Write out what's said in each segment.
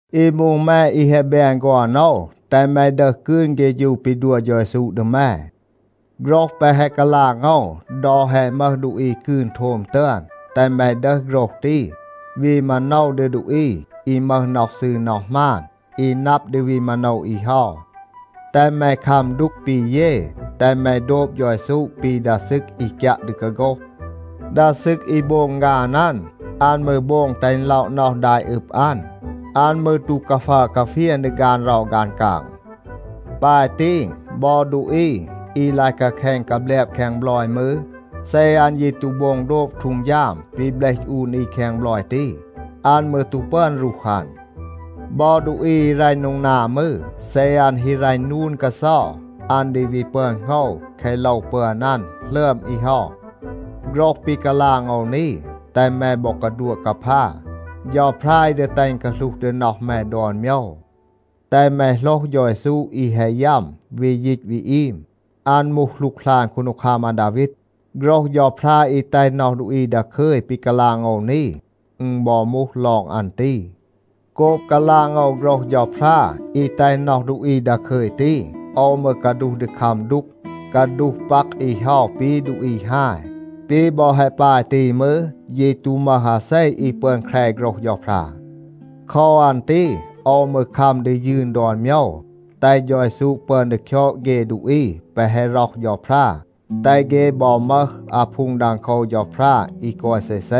อี มูห แม อี แฮะ แบน ฆอน โอว, แตห แม ดึห กืน เฆฌู ปี ดัว เฌา เยซู ดี แม. โฆรห แปะ แฮะ กาลาง โอว ดอ แฮะ มึห ดูอี กืน โทม ตึอน, แตห แม ดึห โฆรห ตี, วี มาโนว ดี ดูอี อี มึห น็อห ซืร น็อห หมาน, อี นับ ดี วี มาโนว อี เฮา. แตห แม คัม ดูก ปี เย, แตห แม โดบ เฌา เยซู ปี ดา ซึก อี กยัะ ดี กาโฆห. ดา ซึก อี โบง ฆาน อัน, อัน มืร โบง แตห อึณ ล็อะ น็อห ดา อี อึบ อัน. อัน มืร ตู กาฟัร กาเฟียน ดี ฆาน เรา ฆาน กาง. ปาย ตี, บอ ดูอี อี ลาย กาแคณ กาแบลบ แคง บลอย มืร, เซ อัน ยี ตู โบง โดบ ฮีด ปี เบลห อูน อี แคง บลอย ตี, อัน มืร ตู ปึอน รูห อัน. บอ ดูอี อี รัณ โดง นา มืร, เซ อัน ฮี รัณ นูน กาเซา, อัน ดี วี ปึอน โหงว แคะ โลว ปึอน อัน หลึอม อี เฮา. โฆรห ปี กาลาง โอว นี, แตห แม บอ กาดัวะ กาพา. เฌาพรา อี ดี แตห อึณ กาหลูห ดี น็อห แม ดอน โมยว. แตห แม โหลห เฌา เยซู อี แฮะ ยัม, วี ยีต วี อีม. อัน มูห หลูกหลาน คูนดีคัม อาดาวีด. โฆรห เฌาพรา อี แตห น็อห ดูอี ดาคึย ปี กาลาง โอว นี, อึณ บอ มูห ลอง อัน ตี. โกบ กาลาง โอว โฆรห เฌาพรา อี แตห น็อห ดูอี ดาคึย ตี, โอว มืร กาดูห ดี คัม ดูก, กาดูห ปัก อี เฮา ปี ดูอี ฮาย. ปี บอ แฮะ ปาย ตี มืร, ยี ตู มึห อาเซ อี ปึอน แคร โฆรห เฌาพรา. โคว อัน ตี โอว มืร คัม ดี ยืน ดอน โมยว, แตห เฌา เยซู ปึอน ดี คยอด เฆ ดูอี แปะ แฮะ ร็อห เฌาพรา, แตห เฆ บอ มึห อาพูง ดังโคว เฌาพรา อี กอย เซเซ.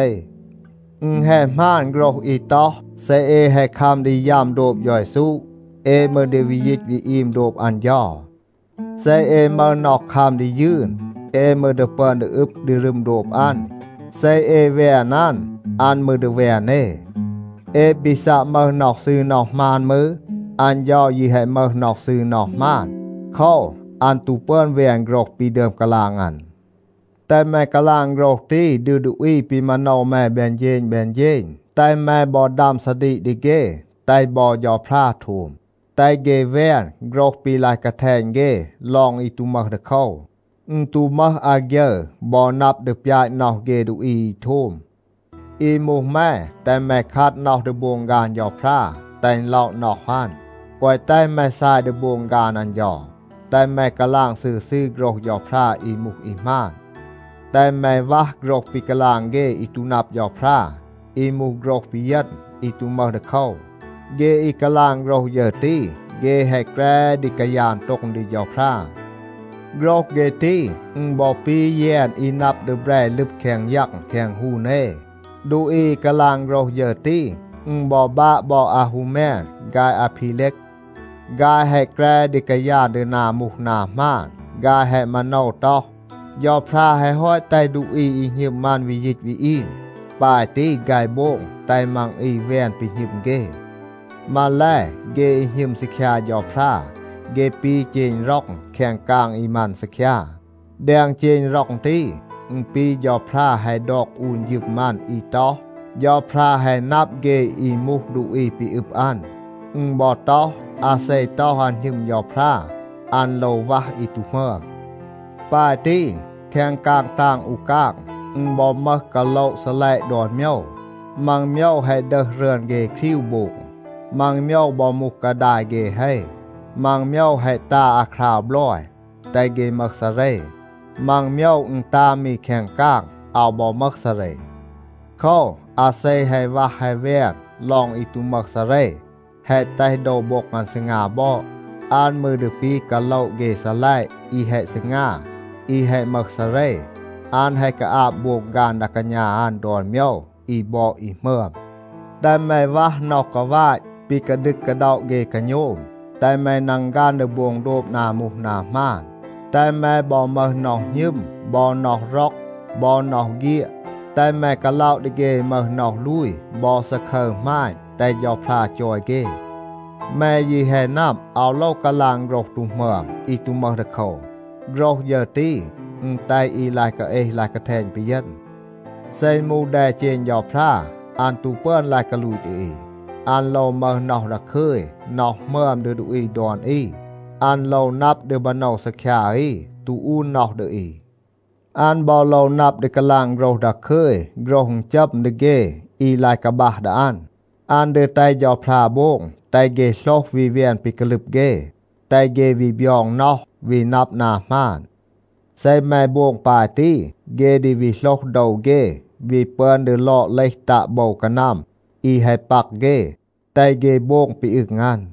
อึณ แฮะ หมาน โฆรห อี ต็อห, “เซ เอ แฮะ คัม ดี ยัม โดบ เฌา เยซู, เอ มืร ดี วี ยีต วี อีม โดบ อัน เฌา. เซ เอ มึห น็อห คัม ดี ยืน, เอ มืร ดี ปึอน ดี อึบ ดี รึม โดบ อัน. เซ เอ แวน อัน, อัน มืร ดี แวน เอ. เอ ปี ซัะ มึห น็อห ซืร น็อห หมาน มืร, อัน เฌา ยี แฮะ มึห น็อห ซืร น็อห หมาน. โคว, อัน ตู ปึอน แวน โฆรห ปี ดึอม กาลาง อัน.” แตห แม กาลาง โฆรห ตี ดี ดูอี ปี มาโนว แม แบน เฌณ แบน เฌณ. แตห แม บอ ดัม ซาดีก ดี เฆ, แตห บอ เฌาพรา โทม. แตห เฆ แวน โฆรห ปี ลาย กาแทณ เฆ ลอง อี ตู มึห ดีโคว. อึณ ตู มึห อาฆยึร บอ นับ ดี ปยาต น็อห เฆ ดูอี อี โทม. อี มูห แม, แตห แม คัด น็อห ดี โบง ฆาน เฌาพรา, แตห อึณ ล็อะ น็อห อัน. แกวะ แตห แม ซาย ดี โบง ฆาน อัน เฌา. แตห แม กาลาง ซืร ซืร โฆรห เฌาพรา อี มูห อี หมาน. แตห แม วัห โฆรห ปี กาลาง เฆ อี ตู นับ เฌาพรา, อี มูห โฆรห ปีเยณ, อี ตู มึห ดีโคว. เฆ อี กาลาง โฆรห ฌึร ตี, เฆ แฮะ แกร ดี กายาน โต็ง ดี เฌาพรา. โฆรห เฆ ตี, อึณ บอ ปี แยน อี นับ ดี แบร ลึบ แคง ยัง แคง ฮูน เอ. ดูอี อี กาลาง โฆรห ฌึร ตี, อึณ บอ บาะ บอ อาฮูแมน ฆาย อาพีเลก. ฆาย แฮะ แกร ดี กายาน ดี นา มูห นา หมาน. ฆาย แฮะ มาโนว ต็อห, เฌาพรา แฮะ ฮอต แตห ดูอี อี หณึม อัน วี ยีต วี อีม. ปาย ตี ฆาย โบง แตห มัง อี แวน ปี หณึม เฆ มาแล, เฆ อี หณึม ซีคยา เฌาพรา, เฆ ปี เจณ ร็อง แคง กาง อี มัน ซีคยา. แดง เจณ ร็อง ตี, อึณ ปี เฌาพรา แฮะ ดอก อูน ฌึม อัน อี ต็อห, “เฌาพรา แฮะ นับ เฆ อี มูห ดูอี ปี อึบ อัน.” อึณ บอ ต็อห, “อาเซ ต็อห, อัน หณึม เฌาพรา, อัน โลว วัห อี ตู หมึอม.” ปาย ตี, แคง กาง ตาง อู กาง, อึณ บอ มึห กาโละ ซีลัยะ ดอน โมยว. มัง โมยว แฮะ ดึห รึอน เฆ ครีว โบง. มัง โมยว บอ มูห กาดาย เฆ เฮ. มัง โมยว แฮะ ตา อาคราว บลอย, แตห เฆ มึห ซาเร. มัง โมยว อึณ ตา มี แคง กาง, อาว บอ มึห ซาเร. โคว, อาเซ แฮะ วัห แฮะ แวน ลอง อี ตู มึห ซาเร, แฮะ แตห โดว โบ็ง อัน ซีงา บอด, อัน มืร ดี ปี กาโละ เฆ ซีลัยะ อี แฮะ ซีงา, อี แฮะ มึห ซาเร. อัน แฮะ กาอาบ โบง ฆาน ดา กาณา อัน ดอน โมยว อี บอด อี หมึอม. แตห แม วัห น็อห กาวาต ปี กาดึก กาด็อะ เฆ กาโณม. แตห แม นังฆัน ดี โบง โดบ นา มูห นา หมาน, แตห แม บอ มึห น็อห หณึม บอ น็อห ร็อก บอ น็อห เฆียด. แตห แม กาล็อะ ดี เฆ อี มึห น็อห ลูย บอ ซาคึร หมาณ, แตห เฌาพรา จอย เฆ. แม ยี แฮะ นับ, อาว โลว กาลาง โฆรห ตู หมึอม อี ตู มึห ดีโคว. โฆรห ฌึร ตี, อึณ แตห อี ลาย กาเอห ลาย กาแทณ ปีเยณ. เซ อึณ มูห แดเจณ เฌาพรา, อัน ตู ปึอน ลาย กาลูต ดี อี. อัน โลว มึห น็อห ดาคึย, น็อห หมึอม ดี ดูอี ดอน อี. อัน โลว นับ ดี มาโนว ซีคยา อี, ตู อูน น็อห ดี อี. อัน บอ โลว นับ ดี กาลาง โฆรห ดาคึย, โฆรห อึณจัม ดี เฆ อี ลาย กาบัห ดี อัน. อัน ดี แตห เฌาพรา โบง แตห เฆ โหลห วี แวน ปี กาลึบ เฆ. แตห เฆ วี บยอง น็อห, วี นับ นา หมาน. เซ แม โบง ปาย ตี, เฆ ดี วี โหลห โดว เฆ, วี ปึอน ดี ลอด เลห ตัะ โบว กานัม อี แฮะ ปัก เฆ, แตห เฆ โบง ปี อึง อัน.